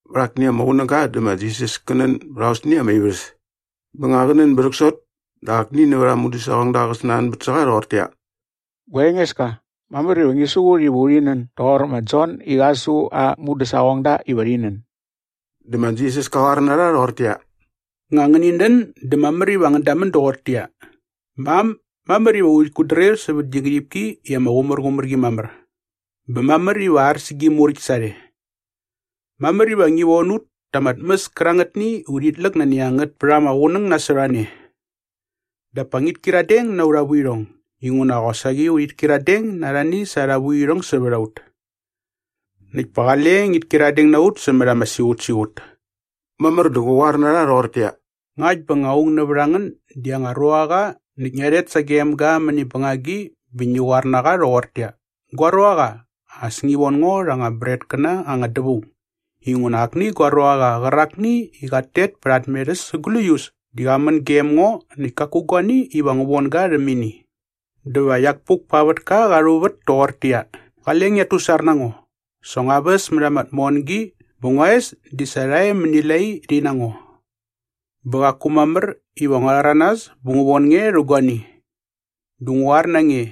Vät akni ama qunäga dä ma Jisas kä nän bät aosni ama ivärhäs. Bä nga qä nän bä rhäksot dä akni nävät aa mudäsaqongda qä snanbät sä qa rhoqortäqyia, “Gua Engeska, mamär iva ngi su ut iva urhi nän doqor ma Jon i qa su aa mudäsaqongda iva rhi nän.” Dä ma Jisas ka qoar na rha rhoqortäqyia, “Nga ngäni nän dä mamär iva ngän damän doqortäqyia, “Mam, mamär iva urhit kutdrir sävät gi ngärhipki i ama qumärqumär qi mamär bä mamär iva ar sä gi muräkt sarhe. Mamär iva ngi von ut ta ama tmäs kärangätni i urhit läk nani a ngät pät ama qunäng nasot a ne. Dap pa ngit kyiradeng na aurha vuirhong inguna qosaqi urhit kyiradeng na arhani sa arha vuirhong sävät a ut. Näkt pa qale ngit kyiradeng na ut sämät ama siqutsiqut.” Mamär dä qä qoar na rha rhoqortäqyia, “Ngakt bä nga aung nävät a ngän di aa anga ruaqa näkt ngia rhet sagem ga mäni bängagi bä ngi qoar na qa rhoqortäqyia, ‘Gua ruaqa, as ngi von ngo rha anga bretkäna anga dävaung inguna akni gua ruaqa qärakni i qat tet pät aa tmerhäs sa gläius di qa män gem ngo näkt kaku guani iva ngu von ga rhäm ini.’” “Dä va iak puk pa aa vätka qa rhuvät toqortäqyia, ‘Qale ngiat tusar na ngo. Sa ngua väs mät ama tmongi bä ngua es di sa rha e mäni lai rhi na ngo. Bä qaku mamär iva ngua rhäranas bä ngu von nge rhä guani.’ “Dä ngu qoar na nge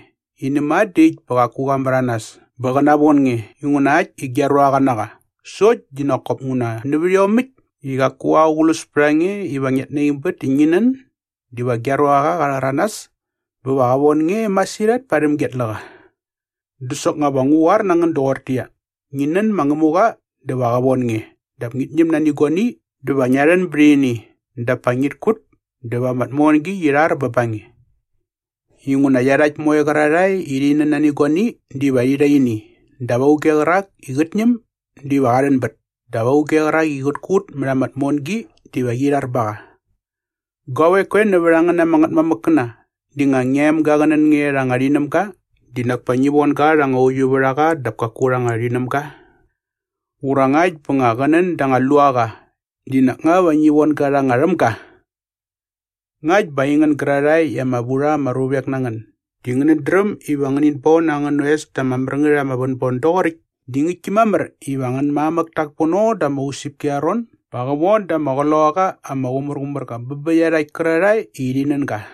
i näma dä äkt bä qaku qa märanas bä qä navon nge inguna äkt i gia ruaqa na qa sokt di nak kop nguna nävät iomäkt i qaku aqlus pät a nge iva ngiat naingbät i ngi nän diva gia ruaqa qa rhäranas bä va qä von nge masirhat parhäm gia tläqa.” “Dä soknga va ngu qoar na ngän doqortäqyia, ngi nän ma Ngämuqa dä va qä von nge dap pa ngit ñäm nani guani dä va ngia rhän bät ini dap pa ngit kut dä va ama tmongi qi rhar bä ba nge. Inguna iarhakt moe qärarhae i rhi nän nani guani diva rhi rha ini dap auge qärak i qät ñäm diva qa rhänbät dap auge qärak i qät kut mät ama tmongi diva qi rhar ba qa. Guavek koe nävät a ngän ama ngätmamäkkäna di nga ngia emga qä nän nani anga rhinämga di nak pa ngi von ga rha anga uiuvärhaqa dap kaku anga rhinämga? Ura ngakt bä nga qä nän da anga luaqa di nak nga va ngi von ga rha anga rhämga? Ngakt bä aingän gärarhae i ama vu rha ama ruvek na ngän di ngänät dräm iva ngänit bon angän oes ta ama mär ngät ama vänbon doqoräkt di ngäktki mamär iva angän mamäk tak pono da ama usäpki arha ron ba qä von da ama Qloqaqa ama Qumärqumärqa bä bä iarhakt kärarhae i rhi nän ga!”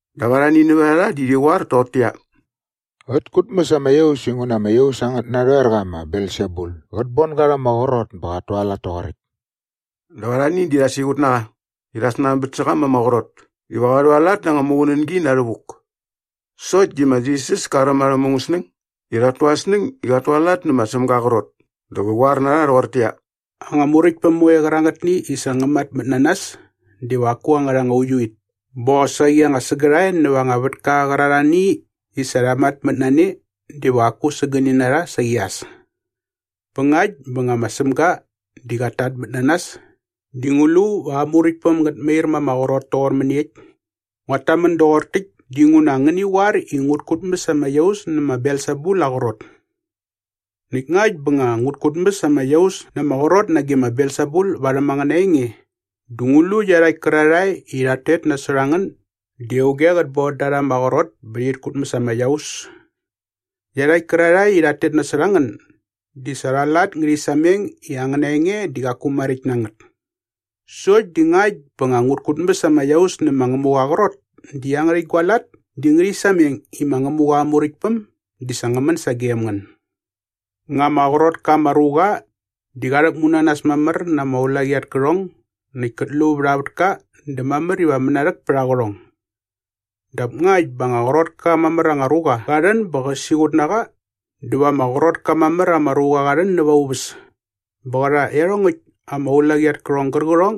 Dap arhani nävät a rha di rhi qoar toqortäqyia, “Qät kutmäs ama iaus inguna ama iaus angät narhoerqa ma Belsebul qät bon ga rha ama qrot bä qat tualat toqoräkt.” Dap arhani di rha siqut na qa i rha snanbät sä qa ma ama qrot iva qa rhualat na anga muqunängi na rhävuk. Sokt di ma Jisas ka räm arhä mungäsnäng i rhat tu arhä snäng i qat tualat nä ma Sämga aa qrot dä qä qoar na rha rhoqortäqyia, “Anga muräktpäm moe qärangätni i sa ngä matmät na nas diva qaku angärha anga uiuit bä qosaqi anga sägärhae näva anga vätka qärarhani i sa rha matmät na ne diva qaku sägäni na rha saqi as. Bä ngakt bä nga ma Sämga di qat tatmät na nas di ngu lu va aa muräktpäm ngät mair ma ama qrot toqor mäniekt? Nguat tamän doqor täkt dinguna ngäni qoar i ngut kutmäs ama iaus nä ma Belsebul aa qrot. Näkt ngakt bä nga ngut kutmäs ama iaus na ama qrot nage ma Belsebul värhäm angäna enge dä ngu lu iarhakt kärarhae i rhat tet nasot a ngän di auge qät bon da rha ama qrot bä rhit kutmäs ama iaus? Iarhakt kärarhae i rhat tet nasot a ngän di sa arha lat ngärhi sameng i angäna enge di qaku maräkt na ngät. Sokt di ngakt bä nga ngut kutmäs ama iaus nä ma Ngämuqa aa qrot di iangärhäkt gua lat di ngärhi sameng i ma Ngämuqa aa Muräktpäm di sa ngä män sagem ngän.” “Nga ama qrot ka ama ruqa di qa rhäkmu na nas mamär na ama ulaqi at kärhong näkt kät lu vät aa vätka dä mamär iva mänarhäk pät aa qärhong. Dap ngakt bä anga qrot ka mamär anga ruqa qa rhän bä qä siqut na qa dä va ama qrot ka mamär ama ruqa qa rhän näva aa uväs bä va qä rha iarhongäkt ama ulaqi at kärhong gärqärhong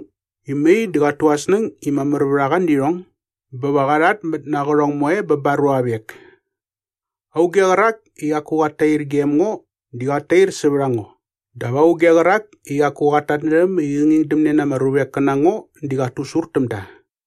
i mai di qat tu aa snäng i mamär na qa nävät irhong bä va qa rhatmät na aa qärhong moe bä ba aa ruavek.” “Auge qärak i qaku qat tair gem ngo di qat tair sävät a ngo. Dap auge qärak i qaku qat tatnärhäm i qä ngingdämne na ama ruvek kä na ngo di qa di qat tusur täm da.”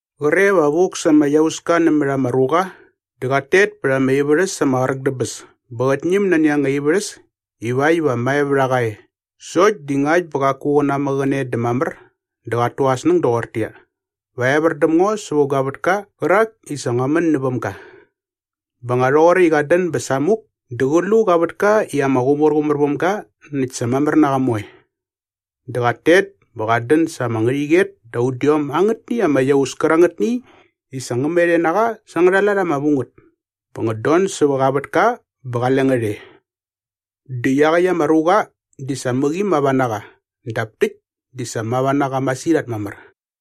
“Qre va vuk sa ama iauska nämät ama ruqa dä qat tet pät ama ivärhäs ama qräk dä bäs bä qät ñäm nani anga ivärhäs ivakt iva mae vät a qa e sokt di ngakt bä qaku qä namäqäne dä mamär dä qat tu aa snäng doqortäqyia, ‘Va evär däm ngo sävä gua vätka qärak i sa ngua män näväm ga.’ Bä nga rhoqoräkt i qat dän bä samuk dä qä lu qa vätka i ama qumärqumär väm ga näkt sa mamär na qa moe. Dä qat tet bä qat dän sa ama ngärhäqyet da udiom angätni ama iaus kärangätni i sa ngä met e na qa sa angärha lat ama vu ngät bä ngät don sävä qa vätka bä qale ngät e. Dä iaqäkt ama ruqa di sa mäqi mava na qa dap täkt di sa mava na qa masirhat mamär.”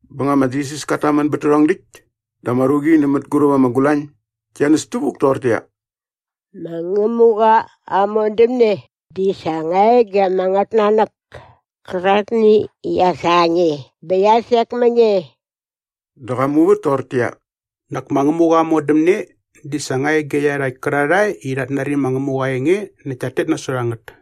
Bä nga ma Jisas kat tamän bät tärhong däkt dä ama ruqi nä mänguräp ama gulañ gia näs tävuk toqortäqyia, “Ma Ngämuqa aa modämne di sa nga e ge ama ngätnanäk käraktni i qia sa nge bä qia sek mä nge.” Dä qa muvät toqortäqyia, “Nak ma Ngämuqa aa modämne di sa nga e ge iarhakt kärarhae i rhat nari ma Ngämuqa aa enge näkt tat tet nasot a ngät.”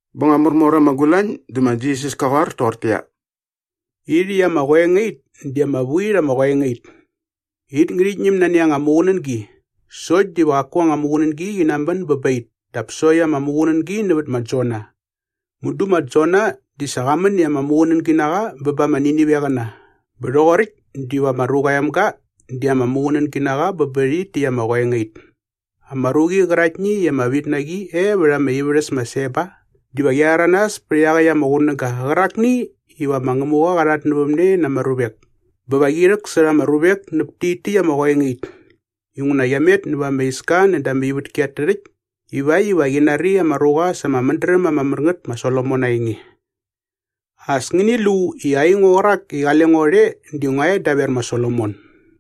Bä nga märmor ama gulañ dä ma Jisas kä qoar toqortäqyia, “Irhäkt ama qoengait di ama vu it ama qoengait. It ngärhit ñäm nani anga muqunängi sokt diva qaku anga muqunängi qi namän bä ba it dap sokt ama muqunängi nävät ma Jona. Mudu ma Jona di sa qa män i ama muqunängi na qa bä ba ama Niniveqäna bä rhoqoräkt diva ma Ruqa aa Emga di ama muqunängi na qa bä bä rhit täkt ama qoengait. Ama ruqi qäraktni i ama vit na qi e vät ama ivärhäs ma Seba diva qia rhäranas pät iaqäkt ama qunäga qärakni iva ma Ngämuqa qa rhatnävämne na ama ruvek bä va qi rhäksärha ama ruvek näp tit täkt ama qoengait inguna qia met näva ama iska näda ama ivätki at tärhäkt ivakt iva qi nari ama ruqa sa ama mädräm ama mär ngät ma Solomon aa enge. As ngäni lu i aingo qärak i qale ngo rhe di ngua e daver ma Solomon.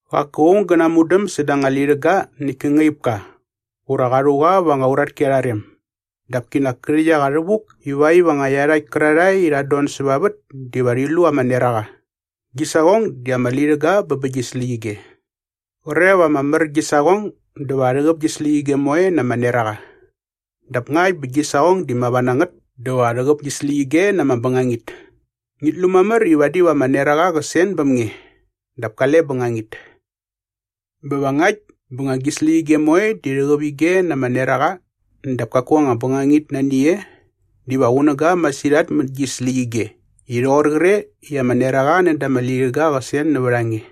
“Qaku aung gä namudäm säda anga lirhäga näkt kä ngaip ka ura qa rhu qa va anga uratki arha rem. Dap kinak kä rhäkt a qa rhävuk ivakt iva nga iarhakt kärarhae i rhat don säva vät diva rhat lu ama neraqa. Gi saqong di ama lirhäga bä bä gi släqyige. Qre va ama mär gi saqong dä va rhäqäp gi släqyige moe na ama neraqa. Dap ngakt bä gi saqong di mava na ngät dä va rhäqäp gi släqyige na ama bängangit. Ngit lu mamär i vadi va ama neraqa qä sen bäm nge dap kale bängangit. Bä va ngakt bä nga gi släqyige moe di rhäqäp ige na ama neraqa dap kaku anga bängangit nani e diva qunäga masirhat mät gi släqyige i rhoqor qre i ama neraqa näda ama lirhäga qä sen nävät a nge.”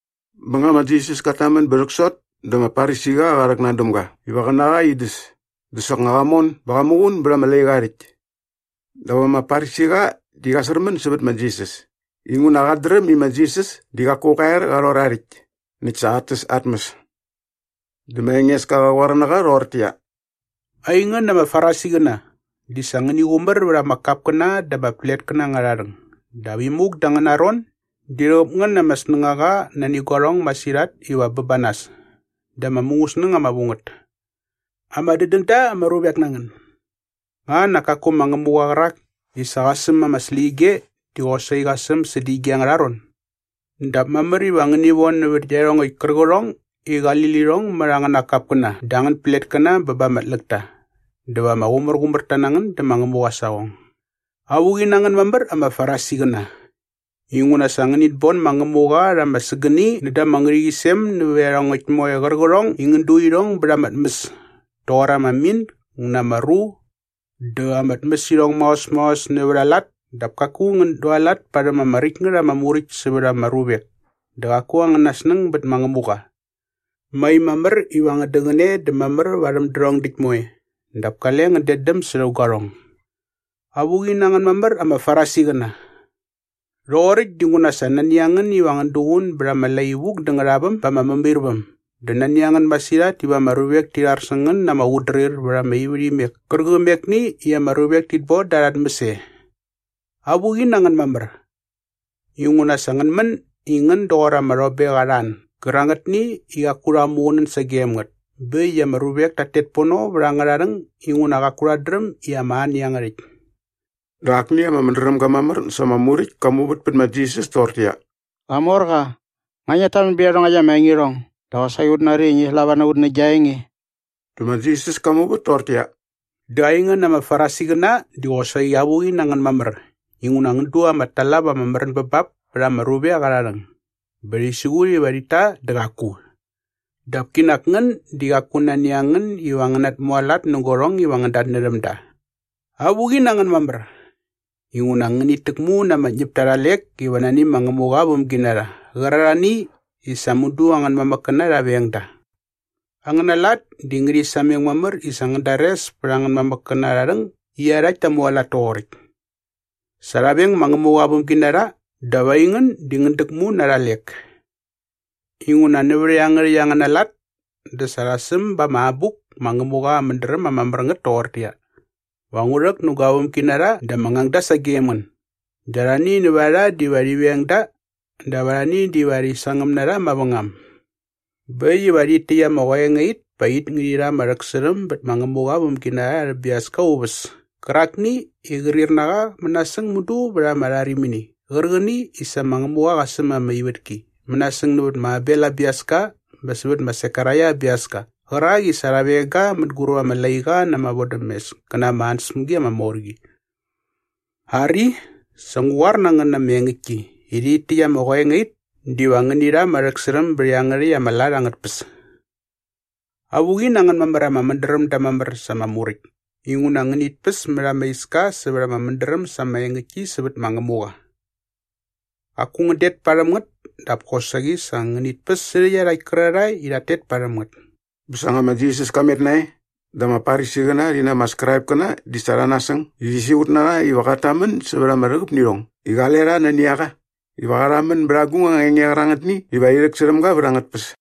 Bä nga ma Jisas kat tamän bä rhäksot dä ama Farisiqa qa rhäknan däm ga iva qä na qa in däs dä soknga qa mon bä qa muqun bät ama laiqa aa rhäkt. Dap ama Farisiqa di qa särmän sävät ma Jisas inguna qat dräm i ma Jisas di qaku qa er qa rhor aa rhäkt näkt sa qat täs aa tmäs. Dä ma Engeska qä qoar na qa rhoqortäqyia, “Aingän ama Farisiqäna di sa ngäni qumär vät ama kapkäna dä ama pletkäna angärha rhäng dap imuk da angäna ron di rhäqäp ngän na ama snängaqa nani guarhong masirhat iva bä ba nas dä ama mungäsnäng ama vu ngät. Ama dädän da ama ruvek na ngän! Nga nak kaku ma Ngämuqa qärak i sa qa säm ama släqyige di qosaqi qa säm sädä ige angärha ron? Dap mamär iva ngäni von nävät iarhongäkt kärqärhong i qali lirhong mät angäna kapkäna dä angän pletkäna bä ba ama tläkta dä va ama qumärqumärta na ngän dä ma Ngämuqa aa saqong.” “Avuqi na ngän mamär ama Farisiqäna! Inguna sa ngänit bon ma Ngämuqa rha ama sägäni näda ama ngärhäqyisem nävät iarhongäkt moe qärqärhong i ngän du irhong bät ama tmäs toqor ama mint ngä na ama ru dä ama tmäsirhong maos maos nävät a lat dap kaku ngän dualat parhäm ama räkt ngät ama muräkt sävät ama ruvek dä qaku angäna snäng bät ma Ngämuqa. Mai mamär iva ngän däqäne dä mamär varhäm därhong däkt moe dap kale ngän detdäm särhä guarhong.” “Avuqi na ngän mamär ama Farisiqäna! Rhoqoräkt dinguna sa nani a ngän iva ngän duqun bät ama lai vuk dä ngärhaväm ba ama mämairväm dä nani a ngän masirhat iva ama ruvek ti rhar sä ngän na ama qutdrir vät ama ivärhimek kärqämekni i ama ruvek tit boda arha tmäs e.” “Avuqi na ngän mamär! Inguna sa ngän män i ngän doqor ama rhobek arha an gärangätni i qaku rha muqunän sagem ngät bä äkt i ama ruvek tat tet pono va angärha rhäng inguna qaku rhat dräm i ama an iangärhäkt.” Dä akni ama mädrämga mamär sa ama Muräkt ka muvät pät ma Jisas toqortäqyia, “Qamorqa, nga ngiat tamän bät iarhongäkt ama engirhong dä qosaqi ut nari i ngi slava na ut nä gia enge.” Dä ma Jisas ka muvät toqortäqyia, “Dä aingän ama Farisiqäna di qosaqi avuqi na ngän mamär inguna ngän du ama talap ama märän bä bap pät ama ruvek arha rhäng bä rhi siqut iva rhit ta dä qaku. Dap kinak ngän di qaku nani a ngän iva ngän natmualat nä guarhong iva ngän datnärhäm da.” “Avuqi na ngän mamär! Inguna ngänit täkmu na ama ñäpta arha lek iva nani ma Ngämuqa aa vämginarha qärarhani i sa mudu angän mamäkkäna rha veng da. Angäna lat di ngärhi sameng mamär i sa ngän dares pät angän mamäkkäna arha rhäng i iarhakt ta mualat toqoräkt. Sa rha veng ma Ngämuqa aa vämginarha dap aingän di ngän däkmu na arha lek. “Inguna nävät iangärhäkt angäna lat dä sa rha säm ba ama abuk ma Ngämuqa Aa Mädräm ama Mär Ngät toqortäqyia, ‘Va ngu rhäk nä gua vämginarha dä ama ngangda sagem da dä arhani nävät a rha diva rhi veng da dap arhani diva rhi sangäm na rha mavängam.’ Bä äkt iva rhit täkt ama qoengait pa it ngärhi rha ama rhäksärhäm bät ma Ngämuqa aa vämginarha arhä biaska aa uväs kärakni i qrir na qa mänasäng mudu vät ama rharimini qärqäni i sa ma Ngämuqa qa säm ama ivätki mänasäng nävät ma Abel aa biaska bä sävät ma Sekaraia aa biaska qärak i sa rha veng ga mänguräp ama laiqa na ama vodämes kä na ama ansäspämgi ama mor qi. Ari, sa ngu qoar na ngän na ama engäktki i rhit täkt ama qoengait diva ngäni rha ama rhäksärhäm bät iangärhäkt ama lat angät tpäs.” “Avuqi na ngän mamär ama mädrämda mamär sa ama Muräkt inguna ngänit päs mät ama iska sävät ama mädräm sa ama engäktki sävät ma Ngämuqa. Qaku ngän det parhäm ngät dap kosaqi sa ngänit päs särhä iarhakt kärarhae i rhat tet parhäm ngät.” Bä sa nga ma Jisas ka met nae dä ama Farisiqäna rhi na ama Skraipkäna di sa rha nasäng i rhi siqut na qa iva qat tamän sävät ama rhäqäp nä irhong i qale rha nani a qa iva qa rhamän bät agung anga enge qärangätni iva rhi rhäksärhäm ga vät angät tpäs.